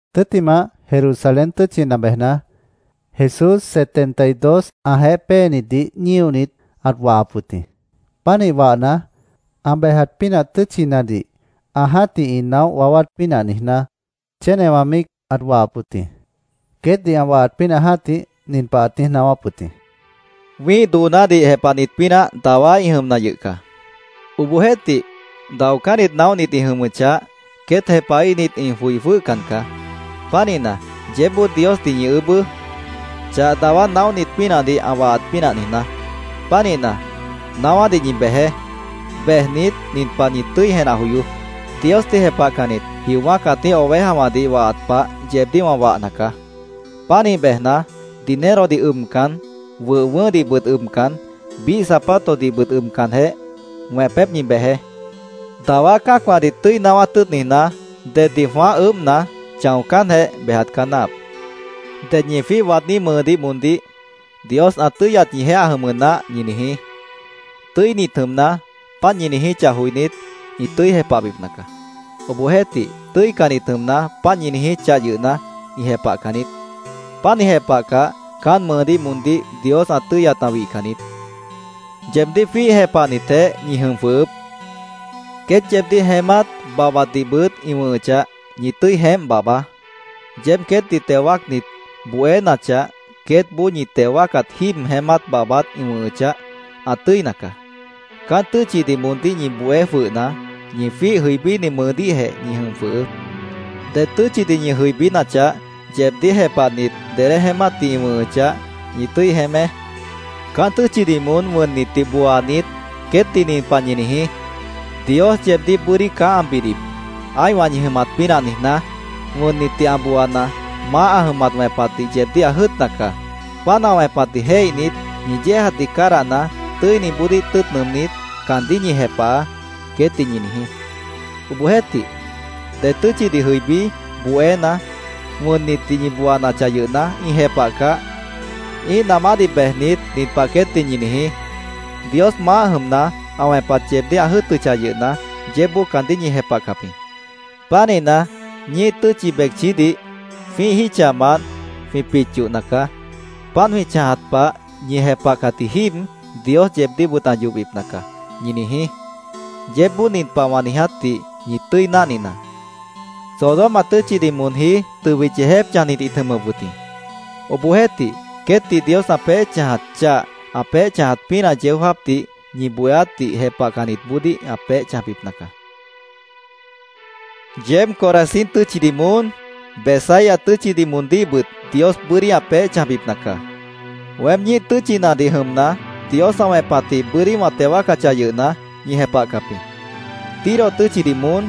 Tʉ́ttimah, Jerusalén tʉ́tchina bejna, Jesús setenta y dos ãjeéh péenitdih ñíonit, ãt wahap wʉt jĩ. Pánih wahna, ã bejat pínah tʉ́tchinadih ã jã́tih ĩ naóh waáwát pínah niijná, chénewã míic ãt wahap wʉt jĩ. Queétdih ã wahat pínah jã́tih, nin pah ãt niíj naáwáp wʉt jĩ: “Wĩ́ih doonádih jepahnit pínah dawá ĩ jʉmna yʉh caá. Obohjeéhtih, daocánnit naóhnit ĩ jʉmʉchah, queét jepahíhnit ĩ joi jwʉ́hcan caá. Pánihna, yeébboó Diosdih ñi ʉʉ́bʉ́, chah dawá naóhnit pínahdih ã wahat pínah niijná. Pánihna, naáwádih ñi bejeé. Bejnit, nin pah ñi tʉ́i jenah joyoó: Diosdih jepahcannit, jiowã́ cãtíh ovejawãdih wahat pah, yeebdíh wã wahna caá. Pánih bejna, dinerodih ʉbcan, wʉh wʉʉ́hdihbʉt ʉbcan, biíh zapatosdihbʉt ʉbcanjeh, wẽpép ñi bejeé. Dawá cã́acwãdih tʉ́i naáwát tʉ́ʉt niijná, deddih jwãáh ʉʉ́bhna, chãocánjeh, bejat caá náahap. Ded ñi jwíih waadní mʉʉdíh moondíh ‘Dios ã tʉ́yat ñijeéh ã jʉmʉ naáh’, ñi niijí. Tʉ́init jʉmna, páant ñi niijíchah joinít, ĩ tʉ́i jepahbipna caá. Obohjeéhtih, tʉ́icannit jʉmna, páant ñi niijíchah yʉhna, ĩ jepahcan niít. Páant ĩ jepahcah, caán mʉʉdíh moondíh Dios ã tʉ́yat ã wihcan niít. Yeebdíh jwíih jepahnitjeéh ñi jʉm jwʉhʉʉ́p. Queét yeebdíh jeémát, babhbatdihbʉt ĩ wʉ̃hʉchah, ñi tʉ́i jeémp babhbaá. Yeéb queétdih teo wáacnit bohénachah, queétboó ñi teo wáacat jíib jeémát babhbat ĩ wʉ̃hʉchah, ã tʉ́ina caá. Caán tʉ́tchidih moondíh ñi bohé jwʉhna, ñi jwíih jʉibíni mʉʉdíhjeh ñi jʉm jwʉhʉʉ́p. Ded tʉ́tchidih ñi jʉibínachah, yeebdíh jepahnit, dedé jeémátdih ĩ wʉ̃hʉchah, ñi tʉ́i jeémé. Caán tʉ́tchidih moón wʉnnitdih booanit, queétdih nin pah ñi niijí: ‘Dios yeebdíh bʉ́dí caá ã bidip, ã́ihwã ñi jʉmat pínah niijná. Wʉnnitdih ã booana, Maáh jʉmna ã wẽpatdih yeebdíh ã jʉ́ʉtna caá. Páant ã wẽpatdih jéihnit, ñi yéejatdih cádahna, tʉ́iniboodíh tʉ́ʉt nʉʉmnít, caandíh ñi jepahaá’, queétdih ñi niijí. Obohjeéhtih, ded tʉ́tchidih jʉibí, bohéna, wʉnnitdih ñi booanachah yʉhna, ĩ jepahcah, ĩ́ih namádih bejnit, nin pah queétdih ñi niijí: ‘Dios maáh jʉmna, ã wẽpat yeebdíh ã jʉ́ʉtʉchah yʉhna, yeébboó caandíh ñi jepahcap jĩ. Pánihna, ñíih tʉ́tchi becchídih jwĩ́ih jítchamant jwĩ pit yohna caá. Páant jwĩ chãjat pah, ñi jepahcatji jíib Dios yeebdíhbʉt ã yohbipna caá’, ñi niijí. Yeébboó nin pah wã niijátdih ñi tʉ́i náhninaá: Sodoma tʉ́tchidih moonjí tʉbit yeejép chãjnit ĩt jʉmʉp wʉt jĩ. Obohjeéhtih, queétdih Dios ã peéh chãjat chah, ã peéh chãjat pínah yeó jáapdih ñi bohéátdih jepahcannitboodíh ã peéh chãjbipna caá”, Jesús queétdih ãt niijíp wʉt jĩ. “¡Yeéb Corazín tʉ́tchidih moón, Betsaida tʉ́tchidih moondíhbʉt Dios bʉ́dí ã peéh chãjbipna caá! Weém ñíih tʉ́tchinadih jʉmna, Dios ã wẽpatjĩh bʉ́dí wã teo wáacachah yʉhna, ñi jepahcap jĩ. Tiro tʉ́tchidih moón,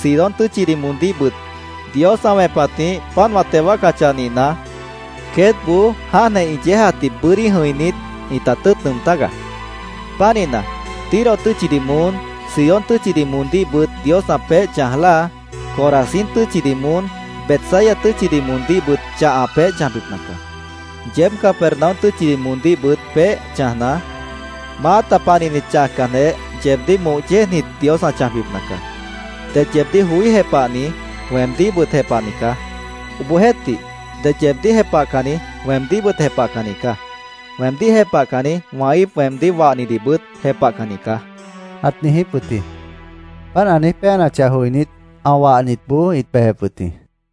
Sidón tʉ́tchidih moondíhbʉt Dios ã wẽpatjĩh páant wã teo wáacachah nihna, queétboó jáantjeh ĩ yéejatdih bʉ́dí jʉ̃inít, ĩta tʉ́ʉt nʉʉm tágaá. Pánihna, Tiro tʉ́tchidih moón, Sidón tʉ́tchidih moondíhbʉt Dios ã peéh chãj láa, Corazín tʉ́tchidih moón, Betsaida tʉ́tchidih moondíhbʉt chah ã peéh chãjbipna caá. Yeéb Capernaum tʉ́tchidih moondíhbʉt peéh chãjna, maáta panihnit chãjcanjeh, yeebdíh moh yéejnit Dios ã chãjbipna caá. “Ded yeebdíh joí jepahni, weemdíhbʉt jepahni caá. Obohjeéhtih, ded yeebdíh jepahcanni, weemdíhbʉt jepahcanni caá. Weemdíh jepahcanni, wã íip weemdíh wahnidihbʉt jepahcanni caá”, ãt niijíp wʉt jĩ. Páant ã niíj péanachah joinít, ã wahnitboó ĩt bejep wʉt jĩ.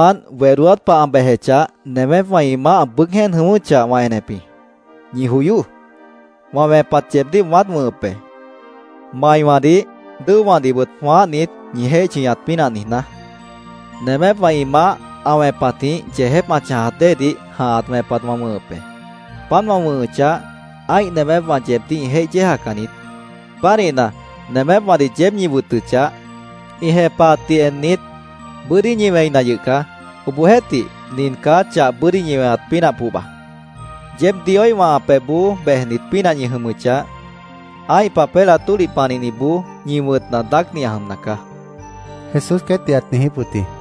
—Japmant wedóát pah ã bejechah, nemépwã ĩ maáh ã bʉʉ́g jéen jʉ̃ʉ́wʉ́chah, wã enep jĩ. ¡Ñi joyoó! Wã wẽpat yeebdíh wãát wʉ̃hʉp be, maiwãdih, dʉ́owãdihbʉt jwãáhnit, ñi jéih chʉñat pínah niijná. Nemépwã ĩ maáh ã wẽpatjĩh yeejép ã chãjat déedih jãhat wẽpat wã wʉ̃hʉp be. Páant wã wʉ̃hʉchah, ã́ih nemépwã yeebdíh ĩ jéih yéejacan niít. Pánihna, nemépwãdih yeéb ñi wʉtʉchah, ĩ jepahatdih ennit, bʉ́dí ñi wẽina yʉh caá. Obohjeéhtih, nin caá chah bʉ́dí ñi weñat pínah pohba: Yeéb Dioíhwã ã pebhboó bejnit pínah ñi jʉmʉchah, ã́ih papélah tólih panihniboó ñi wʉ̃tna daácni ã jʉmna caá, Jesús queétdih ãt niijíp wʉt jĩ.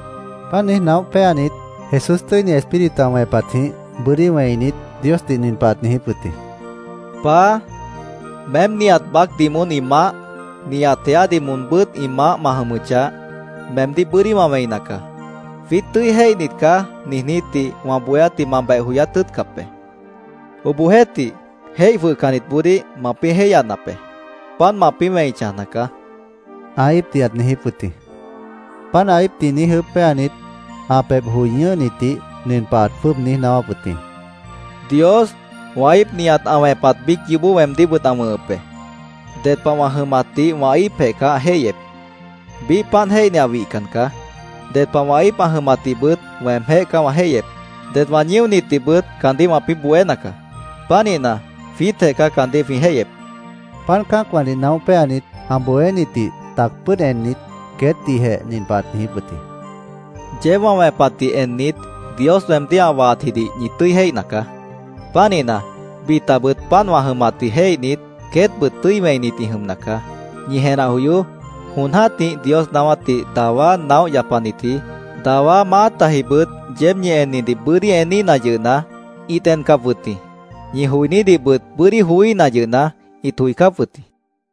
Páant niíj naóh péanit, Jesús Tʉ́ini Espíritu ã wẽpatjĩh bʉ́dí wẽinit, Diosdih nin pah ãt niijíp wʉt jĩ: “Paá, meém nihat baácdih moón ĩ maáh, nihat jeádih moonbʉ́t ĩ maáh ma jʉmʉchah, meemdíh bʉ́dí wã wẽina caá. ‘Jwiít tʉ́i jéihnit caá’, niijnítdih wã bohéátdih ma beh joyát tʉ́ʉtcap be. Obohjeéhtih, jéih jwʉhcannitboodíh mapĩ́ jéihyanap be. Páant mapĩ́ wẽi chãjna caá”, ã íipdih ãt niijíp wʉt jĩ. Páant ã íipdih niíj ʉʉ́bh péanit, ã pébh joi ñʉ́hnitdih nin pah ãt jwʉ́ʉb niíj naáwáp wʉt jĩ: “Dios, wã íip nihat ã wẽpat biíc yoobó weemdíhbʉt ã wʉ̃hʉp be. Ded pah wã jʉmatdih wã íipjeh caá ã jéihyep. Biíh páant jéihni ã wihcan caá. Ded pah wã íip ã jʉmatdihbʉt weemjéh caá wã jéihyep. Det wã ñíonitdihbʉt caandíh wãpĩ́ bohéna caá. Pánihna, jwiítjeh caá caandíh jwĩ jéihyep”, ãt niijíp wʉt jĩ. Páant cã́acwãdih naóh péanit, ã bohénitdih tac pʉ́ʉd ennit, queétdihjeh nin pah ãt niijíp wʉt jĩ: “Yeéb wã wẽpatdih ennit, Dios weemdíh ã wahatjidih ñi tʉ́i jéihna caá. Pánihna, bitabʉt páant wã jʉmatdih jéihnit, queétbʉt tʉ́i wẽinit ĩ jʉmna caá. Ñi jenah joyoó. Jon jã́tih Dios naáwátdih dawá naóh yapanitji, dawá maátajibʉt yeéb ñi ennidih bʉ́dí eníhna yʉhna, ĩt encap wʉt jĩ. Ñi joinídihbʉt bʉ́dí joííhna yʉhna, ĩt joicáp wʉt jĩ”, ãt niijíp wʉt jĩ.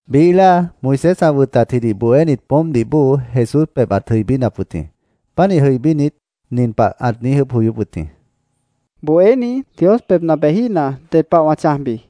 Biíh láa, Moisés ã wʉtatjidih bohénit poómpdih bóo Jesús pebh ãt jʉibínap wʉt jĩ. Pánih jʉibínit, nin pah ãt niíj ʉʉ́bh joyóp wʉt jĩ: —¿Bohéní, Dios pebhna bejíhna, ded pah wã chãjbi? ãt niijíp wʉt jĩ.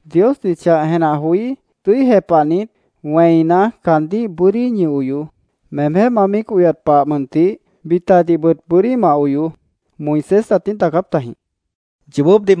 —‘Diosdih chah jenah joí, tʉ́i jepahnit, wẽina, caandíh bʉ́dí ñi oyoó. Meemjéh ma míic oyat pah mʉntih, bitadihbʉt bʉ́dí ma oyoó’, Moisés ãt niíj daacáp tajĩ, ãt niijíp wʉt jĩ.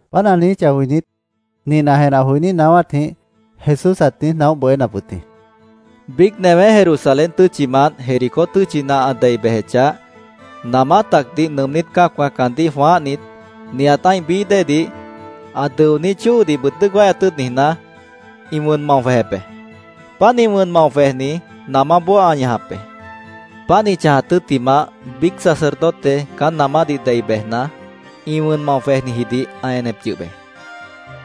Páant ã niijíchah joinít, nin ã jenah joiní naáwátjĩh Jesús ãt niíj naóh bohénap wʉt jĩ: —Biíc newé Jerusalén tʉ́tchimant Jericó tʉ́tchina ã dei bejechah, namá tacdih nʉʉmnít cã́acwã caandíh jwãáhnit, nihat ã́ih bií dée, ã dʉoní chóodihbʉt dʉ́ʉc wáyat tʉ́ʉt niijná, ĩ wʉn mao jwejep be. Páant ĩ wʉn mao jwejni namáboó ã ñajap be. Páant ĩ chãjat tʉ́ttimah, biíc sacerdote caán namádih dei bejna, ĩ wʉn mao jwejnijidih ã enep yʉh be.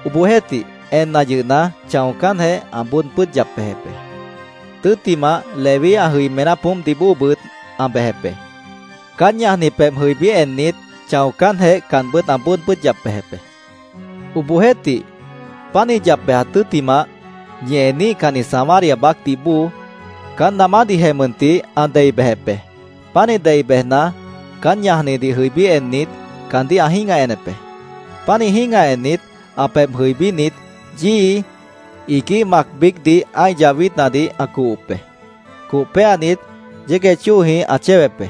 Obohjeéhtih, enna yʉhna, chãocánjeh, ã bóod pʉ́ʉd yap bejep be. Tʉ́ttimah, Leví ã jʉimená poómpdih bóobʉt ã bejep be. Caán ñajni pebh jʉibí ennit, chãocánjeh, caanbʉ́t ã bóod pʉ́ʉd yap bejep be. Obohjeéhtih, páant ĩ yap bejat tʉ́ttimah, ñi eníhcanni Samaria baácdih bóo caán namádihjeh mʉntih ã dei bejep be. Pánih dei bejna, caán ñajnidih jʉibí ennit, caandíh ã jĩ́gah enep be. Pánih jĩ́gah ennit, ã pebh jʉibínit, yíi, iguíh mac biícdih ã́ih yahwítnadih ã cohop be. Coh péanit, yégueh chóojĩh ã chéwep be.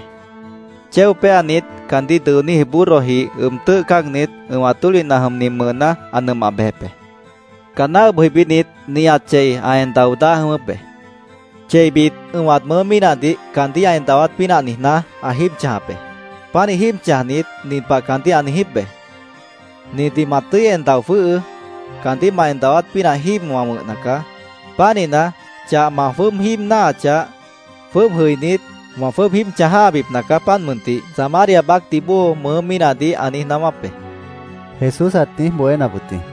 Chéo péanit, caandíh dʉoníji burrodih ʉb tʉ́ʉh cáagnit, ʉ̃wat tólihna jʉmni mʉʉná ã nʉmah bejep be. Caanná ʉb jʉibínit, nihat chei ã en dao dáa jʉ̃ʉ́wʉ́p be. Cheibit, ʉ̃wat mʉʉ́ mínahdih caandíh ã en dawát pínah niijná, ã jíib chãjap be. Pánih jíib chãjnit, nin pah caandíh ã niijíp be: ‘Nindih ma tʉ́i en dao jwʉ́hʉʉ́. Caandíh ma en dawát pínah jíib wã wʉ̃hna caá. Pánihna, chah ma jwʉ́ʉb jíib náahachah, jwʉ́ʉb jʉinít, wã jwʉ́ʉb jíib chãj jã́habipna caá, páant mʉntih’, Samaria baácdih bóo mʉʉ́ mínahdih ã niíj naáwáp be, Jesús ãt niíj bohénap wʉt jĩ.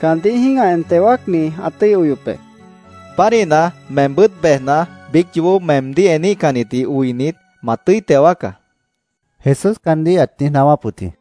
—Caandíh jĩ́gah en teo wáacni ã tʉ́i oyop be, ãt niíj jepahap wʉt jĩ. —Pánihna, meembʉ́t bejna, biíc yoobó meemdíh eníhcannitdih oinit, ma tʉ́i teo wáacá, Jesús caandíh ãt niíj naáwáp wʉt jĩ.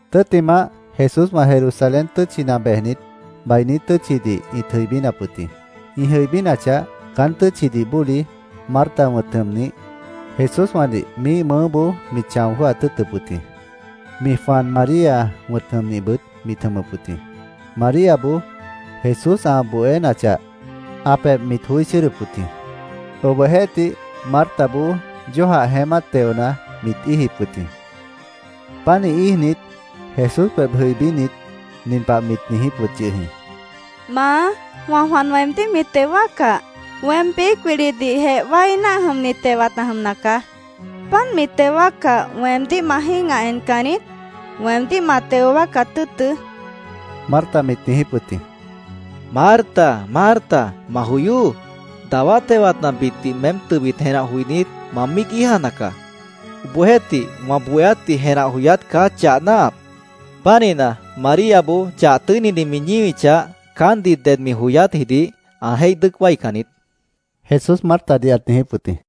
Tʉ́ttimah, Jesúswã Jerusalén tʉ́tchina bejnit, bainí tʉ́tchidih ĩt jʉibínap wʉt jĩ. Ĩ jʉibínachah, caán tʉ́tchidih bóli, Marta wʉ̃t jʉmnih, Jesúswãdih miíh mʉʉ́boó mit chão jwʉ́hat tʉ́ʉtʉp wʉt jĩ. Mi jwan, María wʉ̃t jʉmnihbʉt mit jʉmʉp wʉt jĩ. Maríaboó Jesús ã bohénachah, ã pebh mit joí chʉ́ʉdʉp wʉt jĩ. Obohjeéhtih, Martaboó yójah jeémát teona, mit íijip wʉt jĩ. Pánih íijnit, Jesús pebh jʉibínit, nin pah mit niijíp wʉt yʉh jĩ: —Maá, wã jwan weemdíh mi teo wáaccah, weém biíc wilidihjeh wái náah jʉmni tewat ã jʉmna caá. ¿Páant mi teo wáaccah, weemdíh ma jĩ́gah encan niít? Weemdíh ma teo wáacat tʉ́ʉtʉ́, Marta mit niijíp wʉt jĩ. —¡Marta, Marta, ma joyoó! Dawá tewatnabitdih meém tʉbit jenah joinít, ma míic íijana caá. Obohjeéhtih, wã bohéátdih jenah joyát caá chah náahap. Pánihna, Maríaboó chah tʉ́inidih mi ñíwichah, caántdih ded mi joyátjidih ã jéih dʉ́ʉc wáican niít, Jesús Martadih ãt niijíp wʉt jĩ.